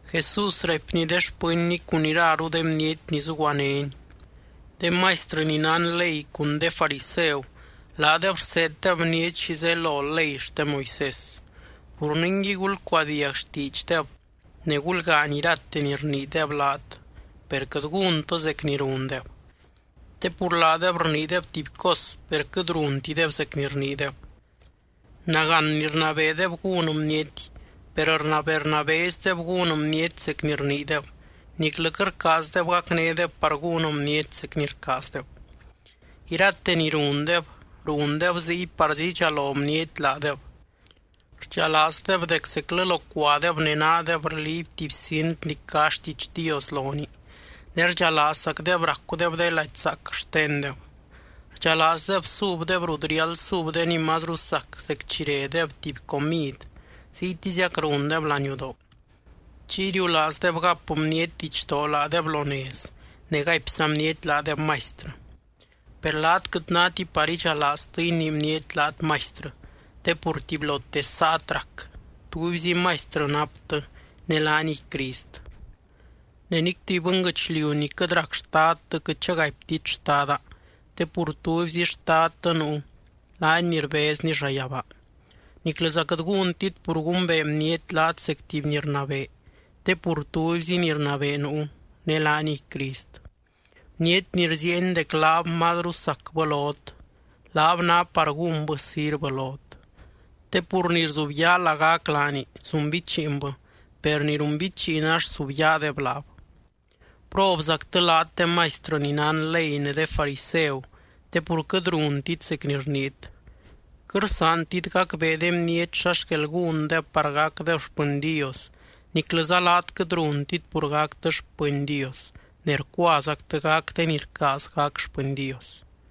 Jesús raipny de xpɨnny cun iraru de bniety ni zuguanény: —De maistrɨ ni nán ley cun de fariseu laadeb rseeddeb bniety xi zelo ley xte Moisés. Pur ningui, gulcuadiag xtiidxdeb ne gulgaany irate ni rniideb laat, per quɨt gúntɨ zec ni rundeb. Te pur laadeb rniideb tuby cos, per quɨt runtideb zec ni rniideb. Nagán ni rnabeedeb gún bniety, per rnabee rnabeezideb gún bniety zec ni rniideb, niclɨ quɨt rcaazdeb gacnédeb par gún bniety zec ni rcaazdeb. Irate ni rundeb, rundeb ziy parzí idxalo bniety laadeb. Rdxalaazdeb dec zeclɨ locuadeb ne naadeb rliiby tuby cint ni cá xtiidx Dios lonii, ne rdxalaazzacdeb racudeb de lady zaac xtendeb. Rdxalaazdeb subdeb rut riáld sub de ni mazru sac zec chi redeb tuby comid, ziytiziac rundeb laniudoo. Chiy riulaazdeb gap bniety didxdoo laadeb lo nez, ne gaipza bniety laadeb maistrɨ. ’Per laat quɨt náti par idxalaaztɨ inii bniety laat maistrɨ, te pur tubylote saat rac. Tubyzi Maistrɨ naptɨ, ne laaniy Crist. Ne nic tuby bɨnguɨchliu ni quɨt rac xtadtɨ quɨt chagaiptit xtada, te pur tubyzi Xtadtɨ nuu, laany ni rbezny llayabaa. Niclɨza quɨt gúntit pur gumbee bniety laat zec tuby ni rnabee, te pur tubyzi ni rnabee nuu, ne laaniy Crist. Bniety ni rziieny dec laab mazru sacbɨ lot, laab ná par gúnbɨ sirvɨ lot. Te pur ni rzubyaa lagac laani, zunbichiinbɨ, per ni runbichiin ax subyaadeb laab. ’¡Probzactɨ laat de maistrɨ ni nán ley ne de fariseu, te pur quɨt runtit zec ni rniit! Quɨt rsaantit gacbee de bniety xa xquel gúndeb par gacdeb xpɨny Dios, niclɨza laat quɨt runtit pur gactɨ xpɨny Dios ne rcuazactɨ gac de ni rcaaz gac xpɨny Dios.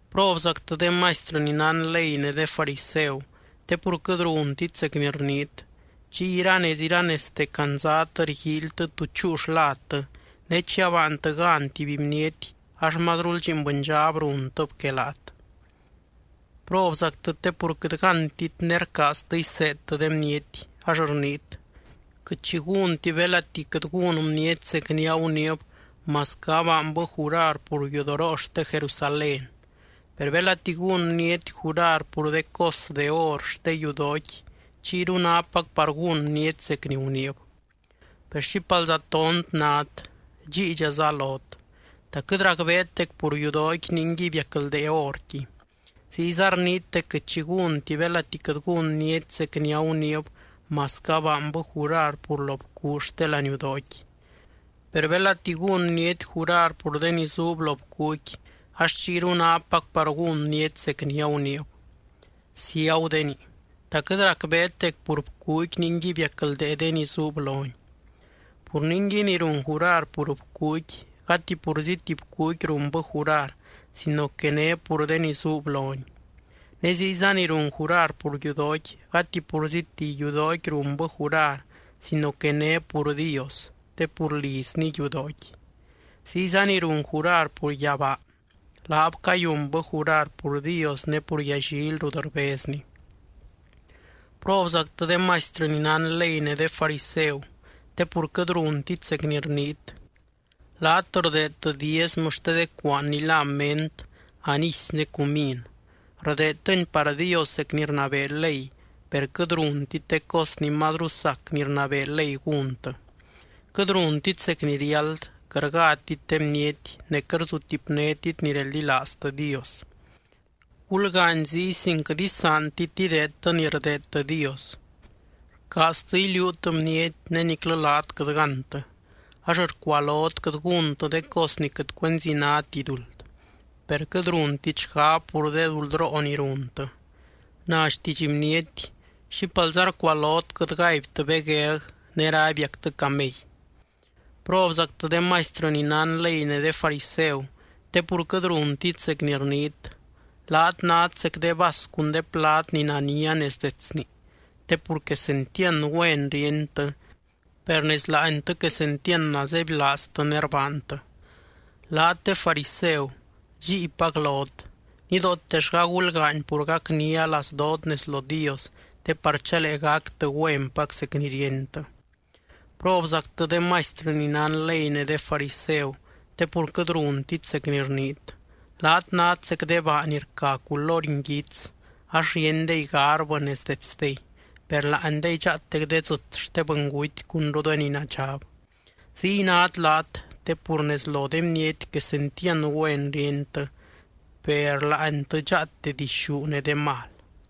’¡Probzactɨ de maistrɨ ni nán ley ne de fariseu, te pur quɨt runtit zec ni rniit! Chiy iranez iranezte candzat rguíilytɨ tú chúu xladtɨ ne chi abaantɨ gan tuby bniety ax mazrul lliin bɨndxab runtɨb que laat. ’¡Probzactɨ te pur quɨt gántit ne rcaaztɨ iseedtɨ de bniety!, ax rniit: “Quɨt xi gúnti belati quɨt gún bniety zec ni aguniib masquɨ abaanbɨ jurar pur yudoroo xte Jerusalén. Per belati gún bniety jurar pur de cos de or xte yudooqui, chiyru nápac par gún bniety zec ni guniib.” ¡Per xípalza tont nát, dxíidxaza lot! ¿Ta quɨt racbeet dec pur yudooqui ningui biacldee orqui? Ziyza rniit dec quɨt xi gúnti belati quɨt gún bniety zec ni aguniib masquɨ abaanbɨ jurar pur lo bcuu xte laniudooqui. Per belati gún bniety jurar pur de ni zuub lo bcuuqui, ax chiyru nápac par gún bniety zec ni aguniib. ¡Ciagudenii! ¿Ta quɨt racbeet dec pur bcuuqui ningui biacldee de ni zuub loni? Pur ningui, ni run jurar pur bcuuqui, gati purzíti bcuuqui runbɨ jurar sino que né pur de ni zuub loni. Ne ziyza ni run jurar pur yudooqui, gati purzíti yudooqui runbɨ jurar sino que né pur Dios, te pur lizny yudooqui. Ziyza ni run jurar pur yabaa, laab cayunbɨ jurar pur Dios ne pur yallily rut rbezny. ’¡Probzactɨ de maistrɨ ni nán ley ne de fariseu, te pur quɨt runtit zec ni rniit! Laat rdeedtɨ diezmɨ xte de cuaan ni lá ment, anísy ne cumín, rdeedtɨni par Dios zec ni rnabee ley, per quɨt runtit de cos ni mazru sac ni rnabee ley gúntɨ. Quɨt runtit zec ni riáld, quɨt rgátit de bniety, ne quɨt rzutipnéti ni reldilaaztɨ Dios. Gulgaany ziy sin quɨt isaantit ideedtɨ ni rdeedtɨ Dios. Rcaaztɨ iliuut bniety ne niclɨ laat quɨt gántɨ, ax rcualot quɨt gúntɨ de cos ni quɨt cuenzi náti duld, per quɨt runtit xgab pur de duldroo ni runtɨ. Na xtiidx bniety: ¡Xípalza rcualot quɨt gaibtɨ begueg, ne rabiactɨ camey! ’¡Probzactɨ de maistrɨ ni nán ley ne de fariseu, te pur quɨt runtit zec ni rniit! Laat nát zec de vas cun de plad ni nania nez detsni, te pur quesentiand güen ríentɨ, per nez láantɨ quesentiand nazebylaaztɨ ne rbaantɨ. Laat de fariseu, dxíipac lot. Nidootellga gulgaany pur gacnia lazdoot nez lo Dios te par chalee gactɨ güenpac zec ni ríentɨ. ’¡Probzactɨ de maistrɨ ni nán ley ne de fariseu, te pur quɨt runtit zec ni rniit! Laat nát zec de baa ni rca culory nguits ax ríendey garbɨ nez detsdey, per láandey dxaatec de dzɨt xte bɨnguty cunru de ni nadxab. Ziy nát laat, te pur nez lo de bniety quesentiand güen ríentɨ, per láantɨ dxaate dixú ne de mal.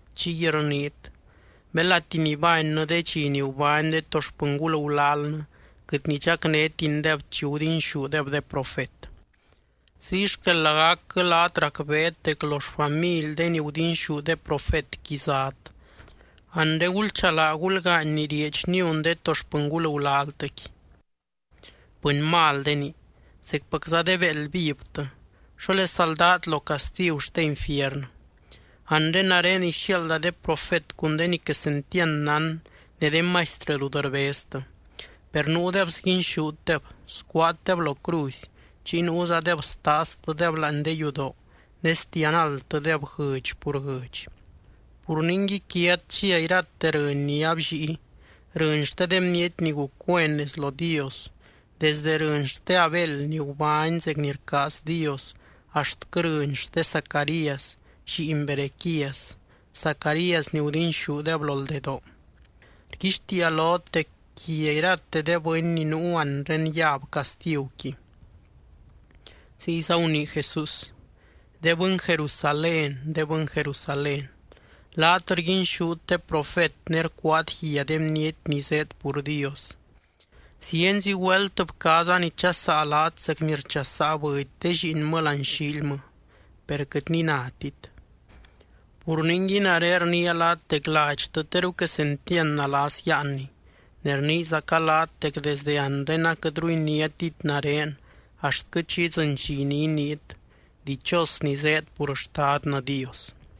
chiy rniit: “Belati nibánnɨ de dxi ni gubány de to xpɨngul gulalnɨ, quɨt nidxacnétindeb chi gudinxúdeb de profet.” Ziy xquel lagacquɨ laat racbeet dec lo xfamily de ni gudinxú de profetqui zát. Anre, ¡gulchalaa gulgaany ni rieedx niun de to xpɨngul gulaltɨqui! ’¡Bɨny maldenii, zecpacza de béeld vivtɨ! ¿Xólesa ldát lo castigu xte infiernɨ? Anre nare ixiaalda de profet cun de ni quesentiand nán ne de maistrɨ rut rbeztɨ. Per nuudeb sguinxútdeb, scuaatdeb lo cruzy, chiy nuuzadeb staaztɨdeb láani de yudoo ne sdianaldtɨdeb guɨdx pur guɨdx. Pur ningui quiat chia irate rɨny ni abllíi, rɨny xte de bniety ni guc güen nez lo Dios, desde rɨny xte Abel ni gubány zec ni rcaaz Dios axtquɨ rɨny xte Zacarías lliin Berequías, Zacarías ni gudinxúdeb lo ldedoo. Rguixtiia lot dec quia irate de bɨny ni nuu anre yab castiguqui. Ziyza gunii Jesús: —¡De bɨny Jerusalén, de bɨny Jerusalén, laat rguinxút de profet ne rcuaat guia de bniety ni zéed pur Dios! ¡Zienzi güelt bcaaza nichasaa laat zec ni rchasaa bɨdy de lliinmɨ láani xiilmɨ, per quɨt ni nátit! Pur ningui, nare rniia laat dec ladxtɨ teru quesentiand nalas yáanni. Ne rniizaca laat dec desde anre aquɨtru iniátit nare axtquɨ chi idzɨny dxi ni iniit: “Dichos ni zéed pur Xtadnɨ Dios.”